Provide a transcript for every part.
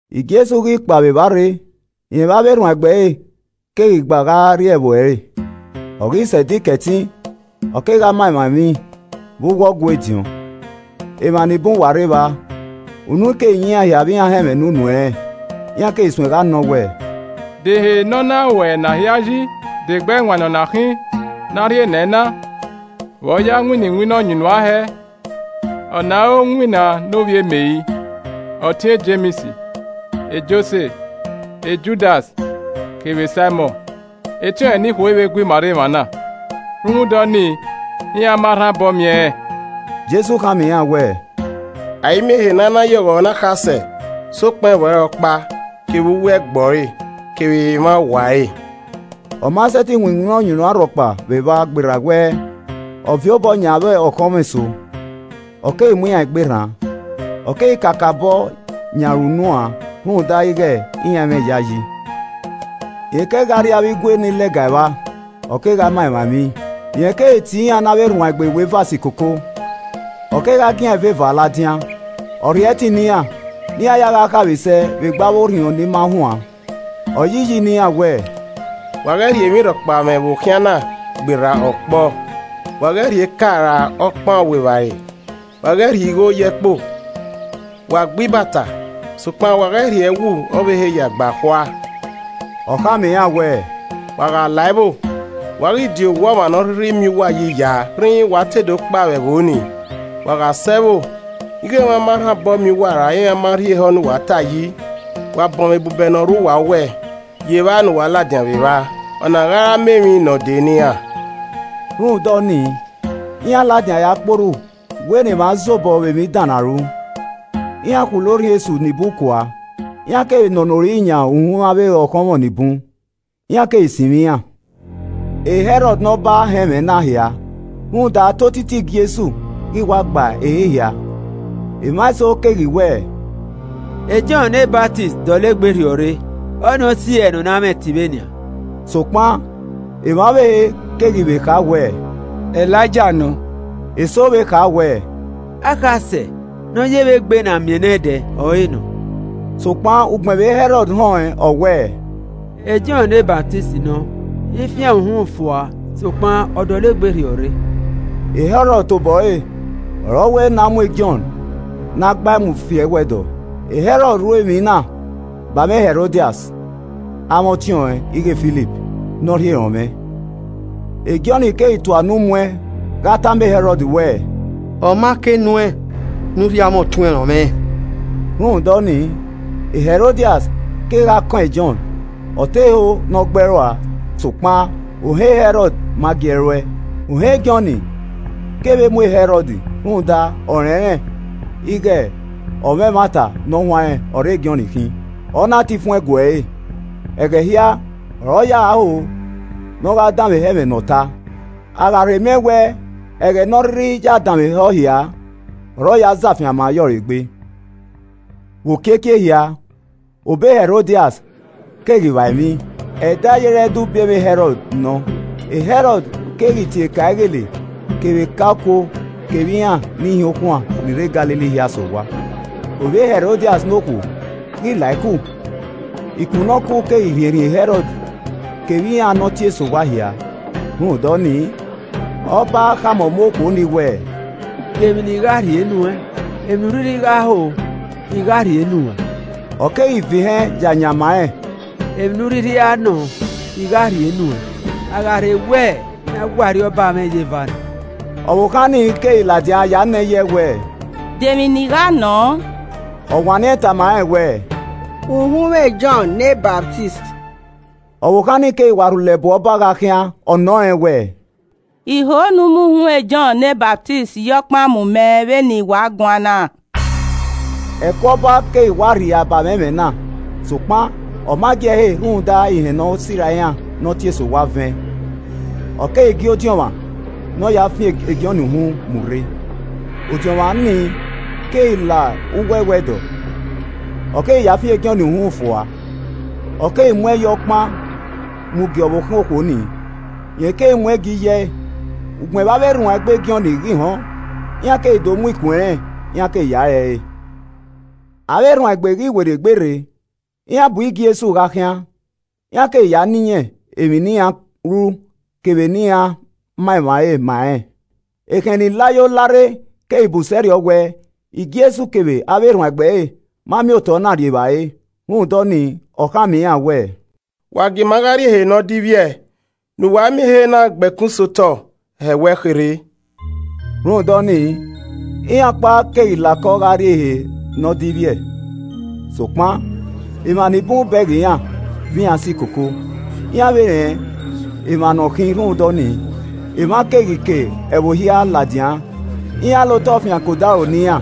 Jesu ghi kpao vbe evba rre, rẹn vbe avbe erhuanegbe ẹre keghi gha gha rrie ẹvbo ẹre. Ọ ghi sẹ Ẹdẹ Ikẹtin, ọ kegha ma emwa emwi vbe uwu Ọgua ediọn. Emwa nibun wa rre evba, unu keghi yan iran hia vbe iran họn ẹmwẹ ne unu ẹnrẹn. Iran keghi suẹn gha nọ wẹẹ, “De ehe ne ọ na ruẹ ena hia yi. De egbe ẹwaẹn ne ọ na khin ne a rhie nẹ ẹn na. Vbe ọ ya winna iwinna ọyunnuan hẹẹ. Ọ na i re owinna ne ovbi Meri, ọtẹn e Jems, Jose, Judas kevbe Saimọn? Etiọnrẹn nikhuo i vbe gu ima rre emwa na?” Rhunmwuda ọnii, iran ma rha obọ miẹn ẹnrẹn. Jesu khama iran wẹẹ, “A i miẹn ehe ne a i na ya ọghọ ne akhasẹ sokpan ẹvbo ẹre ọkpa, kevbe uwu ẹgbẹe ọre, kevbe emwa owa ẹre.” Ọ ma sẹtin winna iwinna ọyunnuan rhọkpa vbe evba gberra wẹ, ọ viọ obọ yan avbe ọkhọnmwọ eso, ọ keghi mu iran egbe rran. Ọ keghi kakabọ yan ẹre unu uan rhunmwuda ighe iran i mwẹ iyayi. Rẹn kegha rrie avbe igue ni lẹga evba, ọ kegha ma emwa emwi. Ọ keghi tie avbe erhaunegbe iweva si koko, ọ kegha gie iran eva ladian. Ọ rhie ẹtin ne iran, ne iran ya gha khaemwisẹ vbe egbe avbe orhiọn ni ma huan, ọ yi iyi ne iran wẹẹ, “Wa ghẹ rhie emwi rhọkpa mwẹ vbe okhian na gberra ọkpọ, wa ghẹ rhie eka ra okpan ọvbuevbare, wa ghẹ rhie igho ye ẹkpo. Wa gba ibata, sokpan, wa ghẹ rhie ẹwu ọvbehe ya gba khua.” Ọ khama iran wẹẹ, “Wa gha la ẹvbo, wa ghi di owa ọmwa ne ọ rhirhi miẹn uwa yi ya rhinrin wa te do kpao vbe ẹvbo nii. Wa gha sẹ ẹvbo ighe emwa ma rhan obọ miẹn uwa ra iran ma rhie ehọ ne uwa ta yi. Wa bọnmwẹ ebubẹ ne ọ rre uwu owẹ ye evba ne uwa ladian vbe evba. Ọna gha re ama emwi ne ọ de ne iran.” Rhunmwuda ọnii, iran ladian ya kpe orhu wẹ ne emwa zobọ vbe emwi dan ne a ru. Iran khulo orhiọn esu nibun kua, iran kevbe nọnọ ori yan uhunmwu avbe ọkhọmwọ ni bun, iran keghi sinmwi iran. E Hẹrọd ne Ọba họn ẹmwẹ na hia rhunmwuda te otiti Jesu ghi wa gba ehe hia. Emwa eso keghi wẹ, “Jọn ne Ọsamẹ dọlegbe rhiọrre. Ọnii ọ si ẹe ne ọ na mwẹ ẹtin vbe nian.” Sokpan emwa ọvbehe keghi vbe kha wẹ, “Elaija nọ.” Eso vbe kha wẹ, “Akhasẹ ne ọ ye vbe egbe ne a miẹn nẹdẹ ọre nọ.” Sokpan ugbẹn vbe Hẹrọd họn ẹn, ọ wẹẹ, “Jọn ne Ọsamẹ nọ, I fian ẹre uhunmwu fua sokpan, ọ dọlegbe rhiọrre.” Hẹrọd tobọ ẹre ọre ọ wẹ ne a mu Jọn ne a gba ẹe mu fi ẹwẹdọ, Hẹrọd ru emwi na ba ẹmwẹ Hẹrodias, amwẹ ọtiọnrẹn ighe Filip ne ọ rhie rọnmwẹ. Jọn keghi tua unu mu ẹn gha tama Hẹrọd wẹẹ, “Ọ ma ke nu ẹn ne u rhie amwẹ ọtuẹn rọnmwẹ.” Rhunmwuda ọnii, Hẹrodias kegha kọn e Jọn, ọ te ho ne ọ gbẹe rua sokpan ohan Hẹrọd ma gi ẹe ru ẹe. Ohan Jọn kevbe mu e Hẹrọd rhunmwuda ọ rẹnrẹn ighe ọmwa ẹmwata ne ọ huanrẹn ọre Jọn khin, ọ na tan ifuẹn gue ẹre. Ẹghẹ hia ọre ọ ya ho ne ọ gha danmwehọ ẹmwẹ ne ọta, a gha rhe miẹn wẹ ẹghẹ ne ọ rhirhi ya danmwehọ hia, ọre ọ ya zẹ afianma ye ọre egbe. Vbe okiekie ehia, obọ Hẹrodias keghi vba emwi. Ẹdẹ ayere ẹdẹ ubiẹmwẹ Hẹrọd nọ. Hẹrọd keghi tie eka ighele kevbe eka okuo kevbe iran ni hin ukhuaẹn ni rre Galili hia sẹ owa. Ovbi Hẹrodias ne okhuo ghi la iku, iku ne ọ kuru keghi rhiẹnrhiẹn e Hẹrọd kevbe iran ne ọ tie sẹ owa hia. Rhunmwuda ọnii, ọba khama ọmọ okhuo nii wẹẹ, “De emwi ne I gha rhie nu ẹn? Emwi ne u rhirhi gha ho, I gha rhie nu ẹn.” Ọ keghi vẹn ihẹn ya yan ma rẹn, “Emwi ne u rhirhi nọọn, I gha rhie nu ẹn, a gha rhe wẹ ne a wa arriọba mwẹ ye eva nọ.” Ọvbokhan ni keghi ladian ya nọ iye ẹe wẹẹ, “De emwi ne I gha nọ?” Ọ wanniẹn tama rẹn wẹ, “Uhunmwu e Jọn ne Ọsamẹ.” Ọvbokhan nii keghi wa rhulẹ bu ọba gha khian, ọ nọ rẹn wẹẹ, “I ho ne u mu uhunmwu e Jọn ne Ọsamẹ ye ọkpan mu mẹ vbe ne i wa guan na.” Ẹko ọba keghi wa rhia ba ẹmwẹ na, sokpan ọ ma gi ẹe he rhunmwuda ihẹn ne ọ sirra iran ne ọ tie sẹ owa vẹn. Ọ keghi gie odiọnmwa ne ọ ya fian Jọn uhunmwu mu rre. Odiọnmwa nii keghi la uwu ẹwẹdọ, ọ keghi ya fian Jọn uhunmwu fua. Ọ keghi mu ẹn ye ọkpan mu gie ọvbokhan okhuo ni, rẹn keghi mu gie iye ẹe. Ugbẹn vbe avbe erhuanegbe Jọn ghi họn, iran keghi do mu ikun ẹnrẹn iran keghi ya re ẹre. Avbe erhuanegbe ghi werriegbe rre, iran bu Jesu gha khian. Iran keghi na iyẹn emwi ne iran ru kevbe ne iran ma emwa re ma rẹn. Ekhẹn ni la yo la rre keghi bun sẹrriọ wẹ Jesu kevbe avbe erhuanegbe ẹre ma miẹn otọ na rri evbare. Rhunmwuda ọnii, ọ khama iran wẹẹ, “Wa gie ima gha rrie ehe ne ọ divbiẹ ne uwa miẹn ehe na gbe ẹkun sẹ otọ hẹwẹ kherhe.” Rhunmwuda ọnii iran ọkpa keghi la okọ gha rrie ehe ne ọ divbiẹ. Sokpan emwa ni bun bẹghe iran vbe iran khian, iran keghi vbe rẹn emwa ne iran khin rhunmwuda ọnii, emwa keghi ke ẹvbo hia ladian, iran la otọ fian ke odaro ne iran,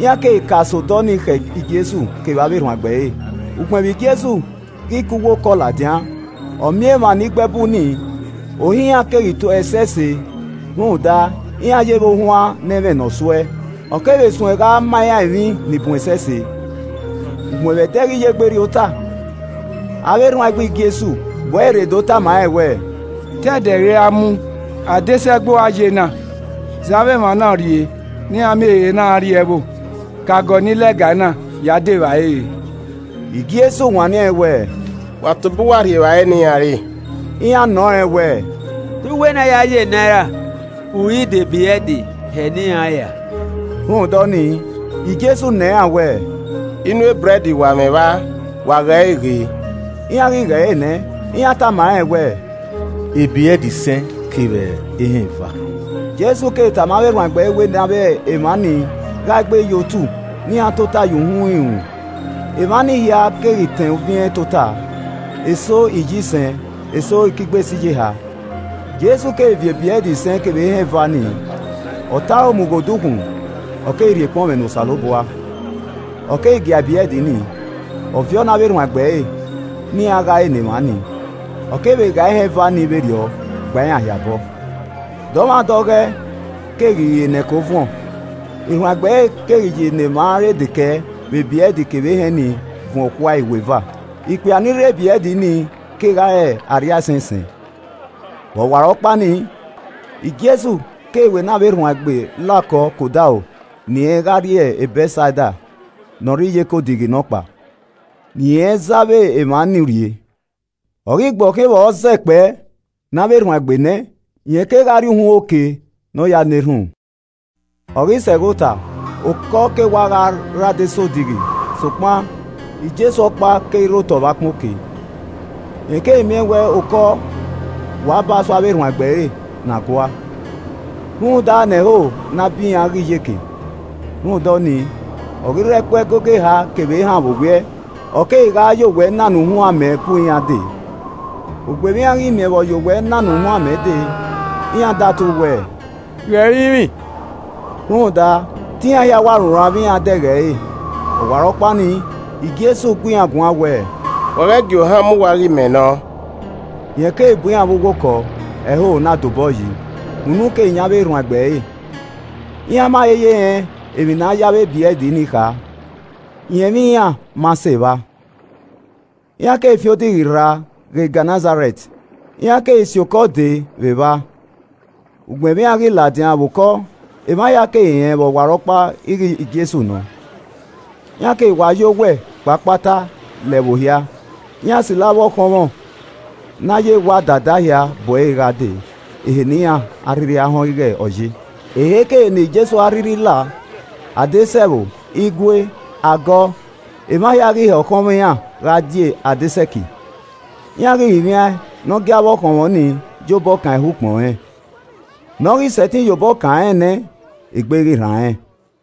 iran keghi ka sẹ ọdọ nii khẹ Jesu kevbe avbe erhuanegbe ẹre. Ugbẹn vbe Jesu ghi ke uwu okọ ladian, ọ miẹn emwa ni gbe ẹbu nii, ohan iran keghi to ẹe ẹsẹse rhunmwuda iran ye vbe ohuan ne ẹ i mwẹ ne ọ su ẹe. Ọ kevbe suẹn gha ma iran emwi ni bun ẹsẹse. Ugbẹn vbe edẹ ghi ye egbe rrie ota, avbe erhuanegbe Jesu bu ẹre rre do tama rẹn wẹẹ, “Te ẹdẹ ghi ra mu, adesẹ ẹgbo ọre a ye na. Zẹ avbe emwa na urrie ne iran miẹn ehe na gha rrie ẹvbo ke agọ ni lẹga ena ya dẹ evbare re.” Jesu wanniẹn wẹẹ, “Wa tobọ uwa rhie evbare ne iran re.” Iran nọ rẹn wẹ, “Te u wẹ ne a ya ye enaira uri dẹ ebrẹd hẹ ne iran ra?” Rhunmwuda ọnii, Jesu nọ iran wẹẹ, “Inu ebrẹd wa mwẹ vba? Wa ghe ẹre ghe.” Iran ghi ghe ẹre nẹ, iran tama rẹn wẹẹ, “Ebrẹd isẹn kevbe ehẹn eva.” Jesu keghi tama avbe erhuanegbe wẹ ne avbe emwa ni ghae egbe ye otu ne iran tota ye uhunmwu irunmwu. Emwa ni hia keghi tẹn uviẹn tota, eso iyisẹn eso ekigbe sẹ iyeha. Jesu keghi viọ ebrẹd isẹn kevbe ehẹn eva ni, ọ tọn aro mu ghe odukhunmwu, ọ keghi rhie ekpọnmwẹ ne Osanobua. Ọ keghi gia ebrẹd nii, ọ viọ ne avbe erhuanegbe ẹre ne iran gha ẹre ne emwa nii. Ọ kevbe ghae ehẹn eva ni vberriọ gba iran hia obọ. Dọmwadẹ oghẹ keghi re ne ẹko vuọn. Erhuanegbe ẹre keghi ya ne emwa re dekẹe vbe ebrẹd kevbe ehẹn ni vuọn okhuae iweva. Ikpia ni rri ebrẹd ni kegha re arriaisẹn isẹn. Vbe ọwarọkpa nii, Jesu keghi we nẹ avbe erhuanegbe la okọ ke odaro ne irẹn gha rrie Bẹtsaida ne ọ rre iyeke odighi nọkpa, ne irẹn zẹ avbe emwa ni urrie. Ọ ghi gbe ọ khian vbe a zẹ kpẹe ne avbe erhuanegbe nẹ, rẹn kegha rrie uhunmwu oke ne ọ ya na erhunmwu. Ọ ghi sẹ ẹghẹ ota, okọ ke wa gha rre adesẹ odighi sokpan Jesu ọkpa keghi rre otọ vbe ọkpẹn oke. Rẹn keghi miẹn wẹ okọ wa ba so avbe erhuanegbe ẹre na gua, rhunmwuda ne ẹhoho na bi iran ghe iyeke, rhunmwuda ọnii, ọ ghi rre ẹkpo ẹgogo eha kevbe ehan vbe owiẹ, ọ keghi gha ya owẹ nana uhunmwu amẹ bu iran de. Ugbẹn vbe iran ghi miẹn vbe ọ ye owẹ nana uhunmwu amẹ dee, iran datu wẹ, “Ghe ẹrinmwi!” Rhunmwuda te iran hia wa runran vbe iran dẹghe ẹre. Ọwarọkpa nii, Jesu gu iran guan wẹẹ, “Wa ghẹ gie ohan mu uwa ighe mẹ nọ.” Rẹn keghi bu iran vbe uwu okọ, ẹhoho na dobọyi, unu keghi yan avbe erhuanegbe ẹre. Iran ma he ye rẹn emwi ne a ya avbe ebrẹd ni kha, irẹnmwi iran ma sẹ evba. Iran keghi fian odighi rra ghe Gẹnẹsarẹt, iran keghi si okọ dee vbe evba. Ugbẹn vbe iran ghi ladian vbe okọ, emwa hia keghi rẹn vbe ọwarọkpa ighe Jesu nọ. Iran keghi wa ya owẹ kpe akpata la ẹvbo hia, iran silo avbe ọkhọnmwọ ne a ya ewa dada hia bu ẹre gha dee ehe ne iran a rhirhi họn ighe ọ ye. Eheikehe ne Jesu a rhirhi lao, adesẹ ẹvbo, igue, agọ, emwa hia ghi hẹ ọkhọnmwọ iran gha die adesẹ ẹki, iran ghi rinmwian ẹn ne ọ gie avbe ọkhọnmwọ ni ya obọ kan ehọ ukpọn rẹn, ne ọ ghi sẹtin ye obọ kan rẹn nẹ, egbe ghi rran rẹn.